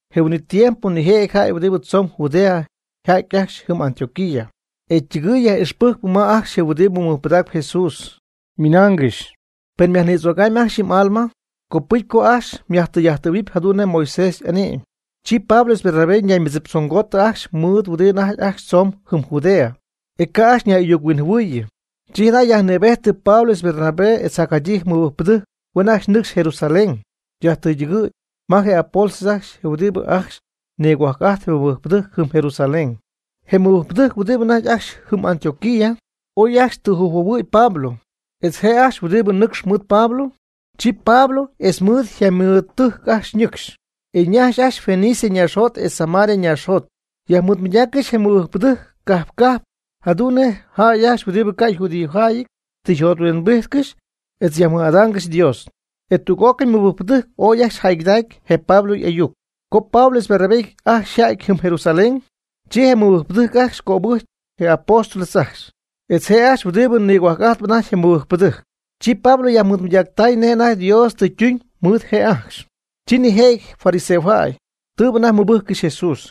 Je huin'it tiempo nijëjɨty jäy huɨdi tzoon Judea yja'ty ajcxy jɨm Antioquía, e ytɨgɨɨy yaj'ixpɨjcp ma ajcxy je huɨdibɨ mɨjpɨdaacp Jesús, ymɨnaangɨxy: “Pen myajnïdzögamy ajcxy yɨ m'alma, copɨcy co ajcxy myajtɨy'ajttɨ̈huɨpy jadu'n nej Moisés y'ane'my.” Chi Pablo etz Bernabé ñaymɨdziptzongootɨ ajcxy mɨɨd huɨdi anajty ajcxy tzomb jɨm Judea, e ca' ajcxy ñay'ayuc-huinjɨhuɨɨyɨ. Chi jada' yajnïbejtɨ Pablo etz Bernabé etz jacjadyii mɨbɨjcpɨdɨjc huen nɨcxy ajcxy Jerusalén yajtɨydɨgɨ̈y ma je apóstoles ajcxy etz huɨdibɨ ajcxy nigohuajc'ajt je mɨbɨjcpɨdɨjc jɨm Jerusalén. Je mɨbɨjcpɨdɨjc huɨdibɨ anajty ajcxy jɨm Antioquía oy ajcxy tüjɨjphuohuɨ̈y Pablo etz je' ajcxy huɨdi nɨcx mɨɨd Pablo. Chi Pablo etz mɨɨd yjaymɨɨdtɨjc ajcxy ñɨcxy, e ñajxy ajcxy Fenicia ñaaxjot etz Samaria ñaaxjot. Yajmɨɨdmɨydaaccɨxy je mɨbɨjcpɨdɨjc cajp cajp jadu'n nej jäy ajcxy huɨdibɨ ca' yjudíojäyɨty tɨ yjothuimbijtcɨxy etz yajmɨj'adaangɨxy Dios. E tüg'ócɨy mɨbɨjcpɨdɨjc ooy ajcxy jäygɨdacy je Pablo y'ayuc. Co Pablo etz Bernabé ajcxy yja'ty jɨm Jerusalén, chi je mɨbɨjcpɨdɨjc ajcxy cöbɨjcɨ je apóstoles ajcxy, etz je' ajcxy huɨdi nigohuajc'ajtp anajty je mɨbɨjcpɨdɨjc. Chi Pablo yajmɨɨdmɨydactay nej anajty Dios tɨ ytuñ mɨɨd je' ajcxy. Chi nijëjɨty fariseojäy, tɨɨbɨ anajty mɨbɨjccɨxy Jesús,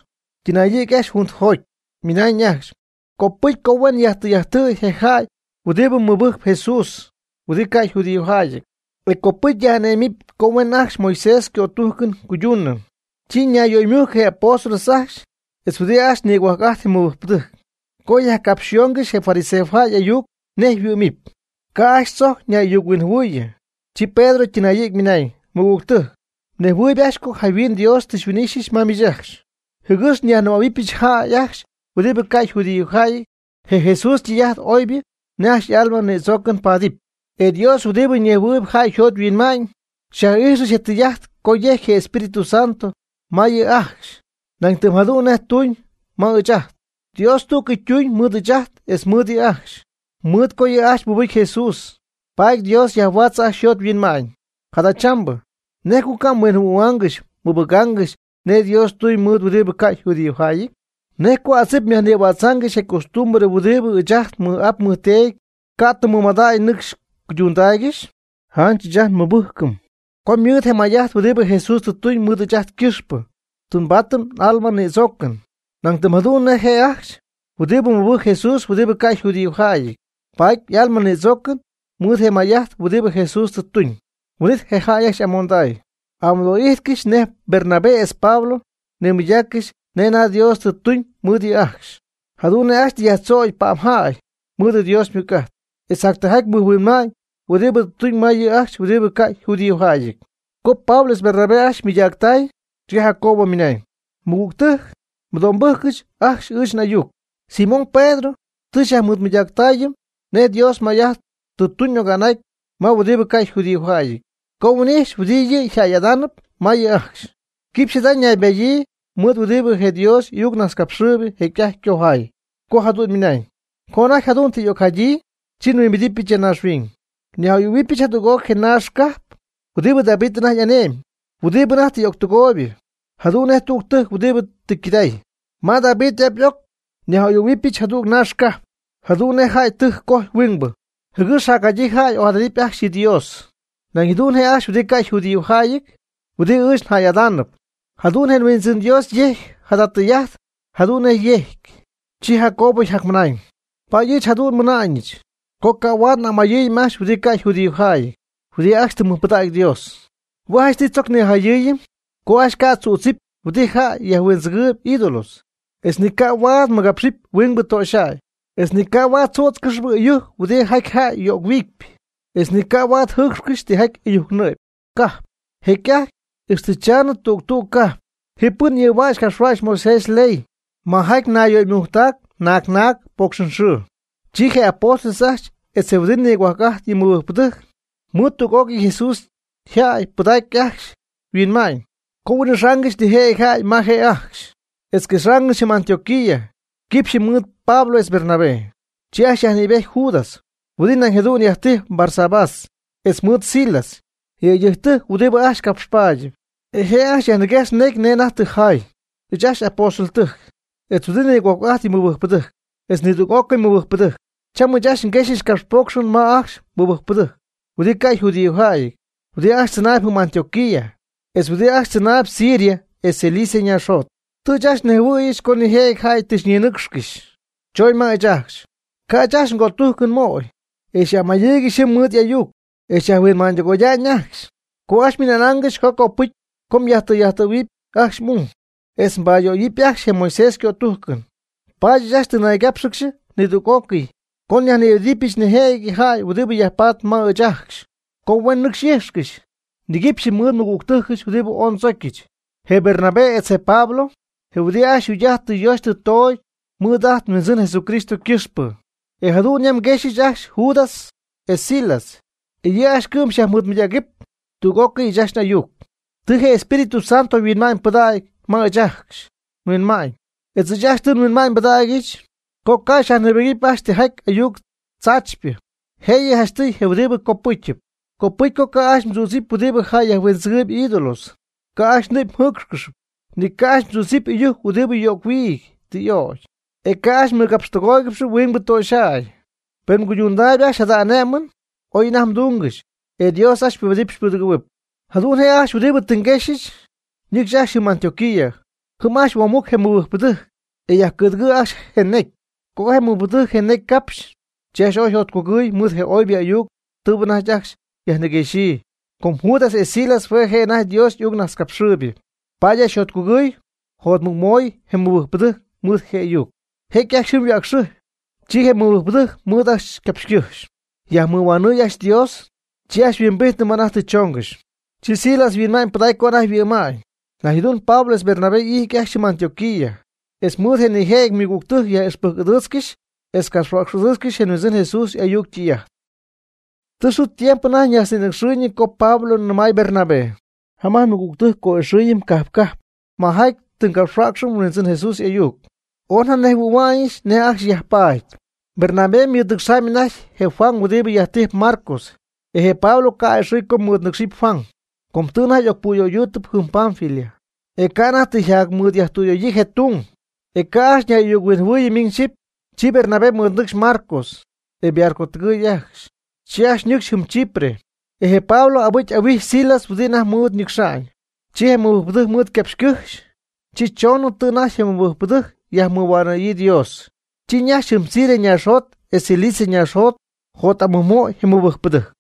ytɨnayɨ̈gy ajcxy juntɨjoty, e ymɨnañ ajcxy: ―Copɨcy co huen yajtɨy'ajttɨ̈y je jäy huɨdibɨ mɨbɨjcp Jesús huɨdi ca' yjudíojäyɨty, e copɨcy nyaj'ané'mɨm co huen ajcxy Moisés ycötújcɨn cuyduunɨ. Chi ñayyöymujcɨ je apóstoles ajcxy etz huɨdi ajcxy nigohuajc'ajtp je mɨbɨjcpɨdɨjc, co capxyöyaangɨxy je fariseojäy y'ayuc nej yhuɨ́'mɨp. Ca' ajcxy tzojc ñay'ayuc-huinjɨhuɨɨyɨ, chi Pedro ytɨnayɨ̈gy ymɨnañ: ―Mɨgügtɨjc, mnejhuɨɨyb ajcxy co jayhuin Dios tɨ xyhuin'ixyɨch ma miich ajcxy, jɨgɨx nyajnɨmähuɨbɨch jäy ajcxy huɨdibɨ ca' yjudíojäyɨty je Jesús ytɨy'ajt oybɨ nej ajcxy y'alma nïdzoocɨn paadɨpy. E Dios huɨdi nejhuɨɨyb jäy yjot yhuinma'ñ xyaj'ijxɨch je tɨy'ajt co yejcy Espíritu Santo ma yɨ' ajcxy nañ tɨm jadu'n nej ytuuñ ma ɨɨch ajt. Dios tú'cɨy ytuñ mɨɨd ɨɨch ajt etz mɨɨd yɨ' ajcxy, mɨɨd co yɨ' ajcxy mɨbɨcy Jesús paady Dios yajhuaatzɨ ajcxy yjot yhuinma'ñ. Jadachambɨ, ¿nej co ca' mhuinjɨhuɨ̈huaangɨxy mɨbɨgaangɨxy nej Dios ytuñ mɨɨd huɨdibɨ ca' yjudíojäyɨty? ¿Nej co adzip myajnïhuidzaangɨxy je costumbre huɨdi ni ɨɨch ajt ni n'ap ndeedy ca' tɨ mɨmadägy nɨcxy cuydundaaygɨxy? Janch ɨɨch ajt nmɨbɨjcɨm co mɨɨd je may'ajt huɨdi Jesús tɨ tuñ mɨɨd ɨɨch ajt ycɨxpɨ tɨ nbaatɨm n'alma ñïdzoocɨn. Nañ tɨm jadu'n je' ajcxy huɨdi mɨbɨjc Jesús huɨdi ca' yjudíojäyɨty ypaat y'alma nïdzoocɨn mɨɨd je may'ajt huɨdi Jesús tɨ tuñ. Huin'it je jäy ajcxy y'amonday, y'amɨdo'ijtcɨxy nej Bernabé etz Pablo nimɨydaaccɨxy nej anajty Dios tɨ tuñ mɨɨd yɨ' ajcxy, jadu'n nej ajcxy tɨ yajtzögy pa'mjäy mɨɨd Dios ymɨc'ajt, etz jac tijaty mɨjhuinma'ñ huɨdi tɨ tuñ ma yɨ jäy ajcxy huɨdi ca' yjudíojäyɨty. Co Pablo etz Bernabé ajcxy mɨydactay, chi Jacobo ymɨnañ: ―Mɨgügtɨjc mɨdo'mbɨ́jcɨgɨch ajcxy ɨɨch n'ayuc. Simón Pedro tɨ xyajmɨɨdmɨydaacɨm nej Dios may'ajt tɨ tuñ oga'n ma huɨdibɨ ca' yjudíojäyɨty, co huin'ijxy huɨdi yɨ' yjäy'adaanɨp ma yɨ' ajcxy. Quipxy jada ñaybadyii mɨɨd huɨdi je Dios y'ayucnajtzcapxɨɨybɨ jecy'ajty ycojay, co jadu'n ymɨnañ: Co anajty jadu'n tɨ y'ocjadyii, chi nhuimbidɨpyɨch ya naaxhuiñ. Nyaj'oyɨ̈huɨbɨch jadüg'oc je naax cajp huɨdi David anajty y'ane'myb huɨdi anajty tɨ y'octɨgooybɨ jadu'n nej tüg tɨjc huɨdi tɨ ycɨday. Ma David y'ap y'oc nyaj'a'oyɨ̈huɨbɨch jadüg naax cajp, jadu'n nej jäy ytɨjc cojy huinjemybɨ. Jɨgɨx jacjadyii jäy y'ojadadɨpy ajcxy yɨ Dios. Nañ jadu'n je' ajcxy huɨdi ca' yjudíojäyɨty, huɨdi ɨɨch njäy'adaanɨp. Jadu'n je Huindzɨn Dios jécyɨp jada tɨy'ajt jadu'n yejcy. Chi Jacobo yjacmɨnañ: ―Paady ɨɨch jadu'n nmɨna'ñɨch co ca' huaad n'amayɨɨyɨm ajcxy huɨdi ca' yjudíojäyɨty huɨdi ajcxy tɨ mɨjpɨdägy Dios. Hue' janchtɨy tzoc nijayɨ́ɨyɨm co ajcxy ca' tzüdzɨpy huɨdi jäy yajhuindzɨgɨɨyb ídolos, etz ni ca' huaad mɨgapxcɨxy huingbɨ töxyjäy, etz ni ca' huaad tzützcɨxy ɨyujc huɨdijaty jäy yöc-huiidypɨ, etz ni ca' huaad jɨɨcxcɨxy tijaty ɨyujc nɨ'py. Jecy'ajty ixtɨ chamnɨ tüg tüg cajp, ji pɨn ɨɨhua'cxp capxhua'cxp Moisés yley majaty nayyöymujctac naag naag pocxɨnxɨɨ. Chi je apóstoles ajcxy etz je huɨdi nigohuajc'ajt yɨ mɨbɨjcpɨdɨjc, mɨɨd tüg'ócɨy Jesús yjäy pɨdacy ajcxy yhuinma'ñ co huin'ixaangɨxy nijëjɨty jäy ma je' ajcxy etz quexaangɨxy jɨm Antioquía quipxyɨ mɨɨd Pablo etz Bernabé. Chi ajcxy yajnïbejty Judas, huɨdi nañ jadu'n yajtijpy Barsabás, etz mɨɨd Silas, yëydɨjctɨjc huɨdi ajcxy capxpaadɨp. E je' ajcxy yajmɨguejxy necy nej anajty tɨ jaay: “Ɨɨch ajcxy apóstoldɨjc, etz huɨdi nigohuajc'ajt yɨ mɨbɨjcpɨdɨjc, etz nidüg'ócɨy mɨbɨjcpɨdɨjc, cham ɨɨch ajcxy nguexy capxpocxɨn ma ajcxy mɨbɨjcpɨdɨjc huɨdi ca' yjudíojäyɨty huɨdi ajcxy tzɨnaayb jɨm Antioquía, etz huɨdi ajcxy tzɨnaayb Siria etz Cilicia ñaaxjot. Tɨ ɨɨch ajcxy nejhuɨ̈yɨch co nijëjɨty jäy tɨ xyñinɨcxcɨxy, choñ ma ɨɨch ajcxy, ca' ɨɨch ajcxy ngötujcɨn mooy, e xy'amayɨɨygɨxy jɨm mɨɨd y'ayuc, e xyajhuinma'ñytɨgoya'ñ ajcxy, co ajcxy xyñɨmaaygɨxy co copɨcy co myajtɨy'ajttɨ̈huɨp ajcxy m'ung, etz mbayöyɨpy ajcxy je Moisés ycötújcɨn. Paady ɨɨch ajcxy tɨ nnaygápxɨgɨxy nidüg'ócɨy co nyajnïbedɨpyɨch nijëjɨty jäy huɨdi yajpaatp ma ɨɨch ajcxy co huen nɨcxy xy'íjxcɨxy niguipxyɨ mɨɨd nmɨgügtɨjcɨch huɨdi ooy ndzocyɨch, je Bernabé etz je Pablo. Je huɨdi ajcxy yjugy'ajt tɨ yoxy tɨ toogy mɨɨd ajt nHuindzɨn Jesucristo ycɨxpɨ. E jadu'n yam nguexyɨch ajcxy Judas etz Silas, e yɨ' ajcxy cɨ'm xyajmɨɨdmɨydägɨpy tüg'ócɨy ɨɨch ajcxy n'ayuc. Tɨ je Espíritu Santo huinma'ñ pɨdägy ma ɨɨch ajcxy nhuinma'ñ etz ɨɨch ajcxy tɨ nhuinma'ñ nbɨdägyɨch, co ca' nyajnïbɨgɨpy ajcxy tijaty ayuc tzaachypɨ, jëyɨ janchtɨy je huɨdi copɨ́cyɨp. Copɨcy co ca' ajcxy mdzüdzɨpy huɨdi jäy yajhuindzɨgɨɨyb ídolos, ca' ajcxy nɨ'py mjɨ́ɨcxcɨxɨpy, ni ca' ajcxy mdzüdzɨpy ɨyujc huɨdi yöc-huiity tɨ y'ögy, e ca' ajcxy mmɨgapxtɨgooygɨxɨpy huingbɨ töxyjäy. Pen mguydundaayb ajcxy jada ané'mɨn, oy anajty mdungɨxy. E Dios ajcxy xypubedɨpy xypudɨgɨ̈huɨpy.” Jadu'n je' ajcxy huɨdi tɨ yajquexy nɨcxy ajcxy jɨm Antioquía. Jɨm ajcxy huoomujcy je mɨbɨjcpɨdɨjc, e yajcɨ̈dɨgɨɨy ajcxy je necy. Co je mɨbɨjcpɨdɨjc je necy capxy, chi ajcxy ooy yjotcugɨɨy mɨɨd je oybɨ ayuc tɨɨbɨ anajty ajcxy yajniguexyii. Com Judas etz Silas hue' je' anajty Dios y'ayucnajtzcapxɨɨybɨ, paady ajcxy yajjotcugɨɨy jot'amɨj moy je mɨbɨjcpɨdɨjc mɨɨd je ayuc. Jecy ajcxy jɨm yhuäcxɨjpy, chi je mɨbɨjcpɨdɨjc mɨɨd ajcxy ycapxycɨjxy, yajmɨhuanɨɨy ajcxy Dios, chi ajcxy yhuimbijtnɨ ma anajty tɨ choongɨxy. Chi Silas yhuinma'ñypɨdacy co anajty yhuɨ'ma'ñ. Nañ jadu'n Pablo etz Bernabé ijt ajcxy jɨm Antioquía, etz mɨɨd jac nijëjɨty ymɨgügtɨjc yaj'ixpɨjc'ɨdɨɨtzcɨxy etz capxhuäcx'ɨdɨɨtzcɨxy je Huindzɨn Jesús y'ayuc ytɨy'ajt. Tɨ xɨɨ tiempo anajty ñajtznïnɨcxɨɨyñɨ co Pablo nɨmay Bernabé: ―Jam'ajt nmɨgügtɨjc co'ixɨɨyɨm cajp cajp majaty tɨ ngapxhuäcxɨm Huindzɨn Jesús y'ayuc. Ooy njanejhuɨ̈hua'ñɨch nej ajcxy yajpaady. Bernabé ymɨɨd nɨcxaamy anajty je Juan huɨdi yajtijp Marcos. E je Pablo ca' a'ɨxɨ̈y co mɨɨd nɨcxɨp Juan, com tɨ anajty y'ocpuyöydúutɨbɨ jɨm Panfilia, e ca' anajty tɨ yjacmɨɨdyajtüyöyii je tung. E ca' ajcxy ñay'ayuc-huinjɨhuɨɨyɨ miñ xyɨpy. Chi Bernabé mɨɨdnɨcxy Marcos e ybarcotɨgɨɨy ajcxy, chi ajcxy ñɨcxy jɨm Chipre. E je Pablo abɨcy huin'ijxy Silas huɨdi anajty mɨɨd ñɨcxa'ñ. Chi je mɨbɨjcpɨdɨjc mɨɨd ycapxycɨ́jxy, chi choonɨ tɨ anajty je mɨbɨjcpɨdɨjc yajmɨhuanɨ̈yii Dios, chi ñajxy jɨm Siria ñaaxjot etz Cilicia ñaaxjot jot'amɨjmooy je mɨbɨjcpɨdɨjc.